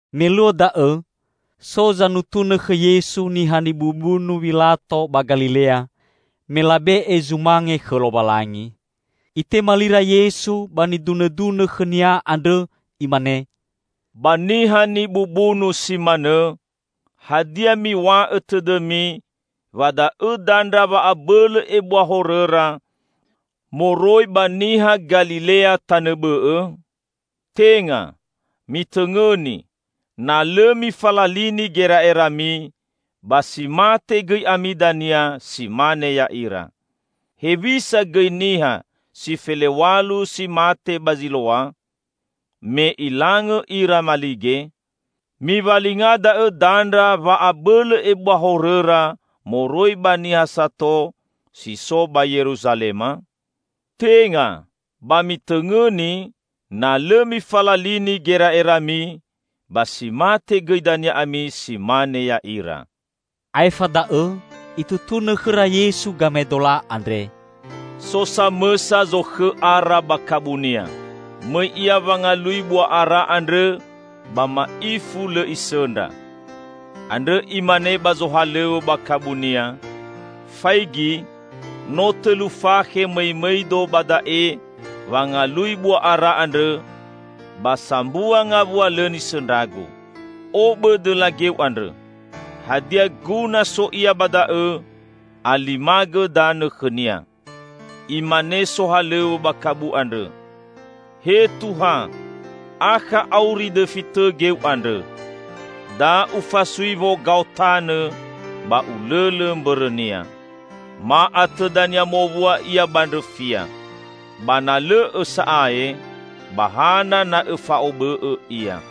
Me luo da'õ so zanutunõ khõ Yesu niha nibubunu Wilato ba Galilea, me labe'e zumange khõ Lowalangi. Itema lira Yesu ba nidunõdunõ khõ-Nia andrõ, Imane, "Ba niha nibubunu si manõ, hadia miw̃a'õ tõdõmi wa da'õ dandra wa'abõlõ ebua horõra moroi ba niha Galilea tanõ bõ'õ? Tenga! Mitõngõni, na lõ mifalalini gera'erami, ba si mate gõi ami dania, si mane ya'ira. Hewisa gõi niha si felew̃alu si mate ba Ziloa, me ilangõ ira malige? Miwalinga da'õ dandra wa abõlõ ebua horõra moroi ba niha sato si so ba Yeruzalema? Tenga! Ba mitõngõni, na lõ mifalalini gera'erami, ba si mate gõi dania ami si mane ya'ira." Aefa da'õ Itutunõ khõra Yesu gamaedola andre, "So samõsa zokhõ ara ba kabunia. Mõi ia wangalui bua ara andrõ ba ma'ifu lõ isõndra. Andrõ imane ba zohalõw̃õ ba kabunia, 'Faigi, no tõlu fakhe mõimõido ba da'e wangalui bua ara andrõ, ba sambua ngawua lõ nisõndragu. Obõ dõla geu andrõ. Hadia guna so ia ba da'õ, alimagõ danõ khõnia!' Imane sohalõw̃õ ba kabu andrõ, 'He Tuha, akha auri dõfi tõ geu andrõ. Da ufasui wogao tanõ ba ulõlõ mbõrõnia. Ma atõ dania mowua ia ba ndrõfia. Ba na lõ'õ sa'ae ba hana na õfa'obõ'õ ia.'"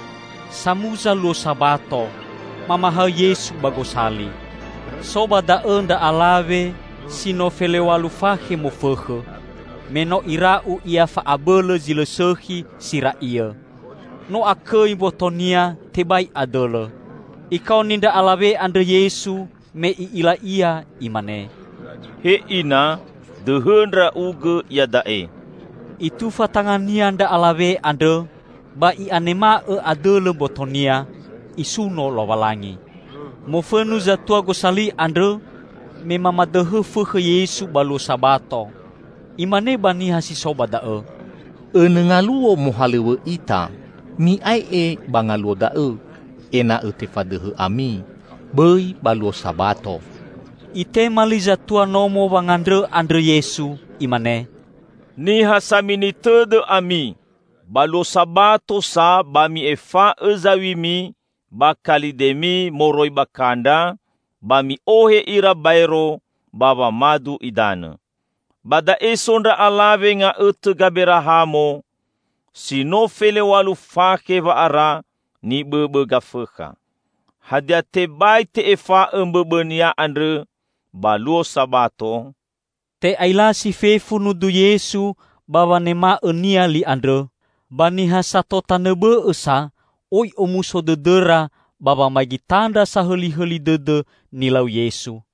Samuza luo Sabato, mamahaõ Yesu ba gosali. So ba da'õ ndra alawe si no felew̃alu fakhe mofõkhõ, meno ira'u ia fa'abõlõ zi lõ sõkhi si ra'iõ. No akõi mbotonia, tebai adõlõ. Ikaoni ndra alawe andrõ Yesu, me I'ila ia, Imane, "He Ina, dõhõ ndra'ugõ iada'e!" Itufa tanga-Nia ndra alawe andrõ, ba i'anema'õ adõlõ mbotonia, isuno Lowalangi. Mofõnu zatua gosali andrõ, me mamadõhõ fõkhõ Yesu ba luo Sabato. Imane ba niha si so ba da'õ, "Õnõ ngaluo mohalõw̃õ ita; mi'ae'e ba ngaluo da'õ ena'õ tefadõhõ ami, bõi ba luo Sabato!" Itema li zatua nomo wangandrõ andrõ Yesu, Imane, "Niha samini tõdõ ami! Ba luo Sabato sa ba mi'efa'õ zaw̃imi ba kalidemi moroi ba kandra, ba mi'ohe ira baero ba wamadu idanõ. Ba da'e so ndra alawe nga'õtõ Gaberahamo, si no felew̃alu fakhe wa'ara nibõbõ Gafõkha. Hadia tebai te'efa'õ mbõbõnia andrõ ba luo Sabato?" Te'ailasi fefu nudu Yesu ba wanema'õ-Nia li andrõ, ba niha sato tanõ bõ'õ sa oi omuso dõdõra ba wamaigi tandra sahõlihõli dõdõ nilau Yesu.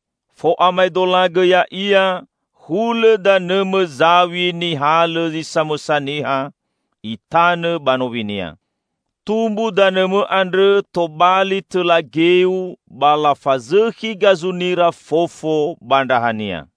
Fo'amaedolagõ ya'ia hulõ danõmõ zaw̃i nihalõ zi samõsa niha itanõ ba nowinia. Tumbu danõmõ andrõ tobali tõla geu ba lafazõkhi gazunira fofo ba ndrahania."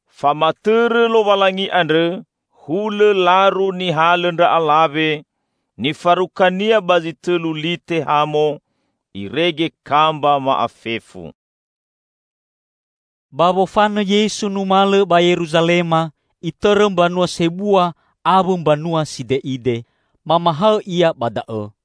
Famatõrõ Lowalangi andrõ hulõ laru nihalõ ndra alawe, nifarukania ba zi tõlu lite hamo, irege kamba ma'afefu." Ba wofanõ Yesu numalõ ba Yeruzalema, Itõrõ mbanua sebua awõ mbanua side'ide, mamahaõ Ia ba da'õ.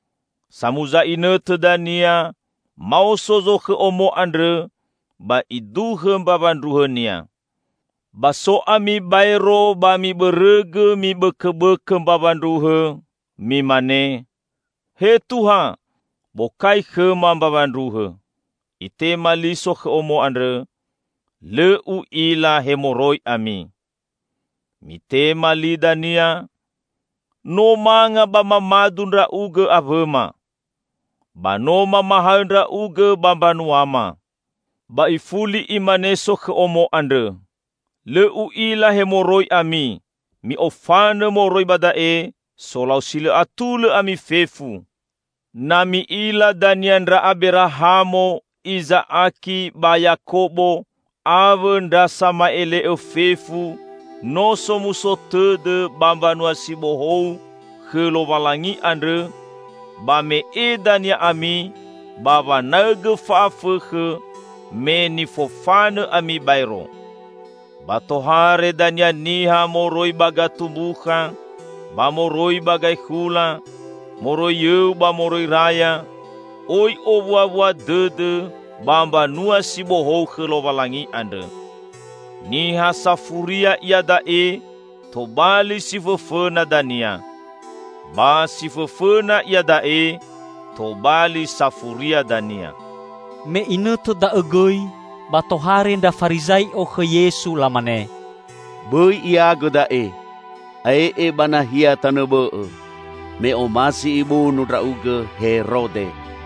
Samuza inõtõ dania maoso zokhõ omo andrõ ba iduhõ mbawa ndruhõnia. Ba so ami baero ba mibõrõgõ mibõkõbõkõ mbawa ndruhõ, mimane, 'He Tuha, bokai khõma mbawa ndruhõ!' Itema li sokhõ omo andrõ, 'Lõ u'ila he moroi ami!' Mitema li dania, 'No manga ba mamadu ndra'ugõ awõma. Ba no mamahaõ ndra'ugõ ba mbanuama!' Ba ifuli imane sokhõ omo andrõ, 'Lõ u'ila he moroi ami, mi'ofanõ moroi ba da'e, solau si lõ atulõ ami fefu!' Na mi'ila dania ndra Aberahamo, Iza'aki ba Yakobo awõ ndra sama'ele'õ fefu no somuso tõdõ ba Mbanua si Bohou khõ Lowalangi andrõ, ba me'e dania ami ba wanaõgõ fa'afõkhõ me nifofanõ ami baero! Ba tohare dania niha moroi ba gatumbukha ba moroi ba gaekhula, moroi yõu ba moroi raya, oi owuawua dõdõ ba Mbanua si Bohou khõ Lowalangi andrõ. Niha safuria iada'e tobali si fõfõna dania. Ba si fõfõna iada'e tobali safuria dania." Me inõtõ da'õ gõi, ba tohare ndra Farizai'o khõ Yesu lamane, "Bõi Iagõ da'e! Ae'e ba nahia tanõ bõ'õ, me omasi ibunu Ndra'ugõ Herode."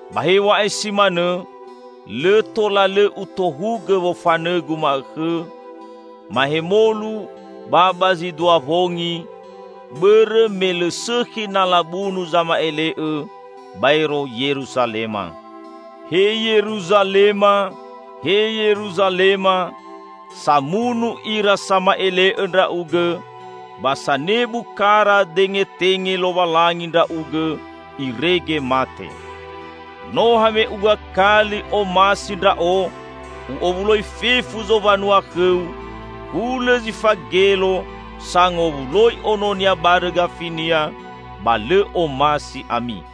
Ba hew̃a'ae si manõ lõ tola lõ Utohugõ wofanõ-Gu ma'õkhõ, mahemolu ba ba zi dua wongi, bõrõ me lõ sõkhi na labunu zama'ele'õ baero Yeruzalema. He Yeruzalema, he Yeruzalema! Samunu ira sama'ele'õ ndra'ugõ! Ba sanebu kara dengetenge Lowalangi ndra'ugõ irege mate! No hame'uga kali omasi Ndra'o U'owuloi fefu zowanua khõu hulõ zifagelo sangowuloi ononia barõ gafinia, ba lõ omasi ami!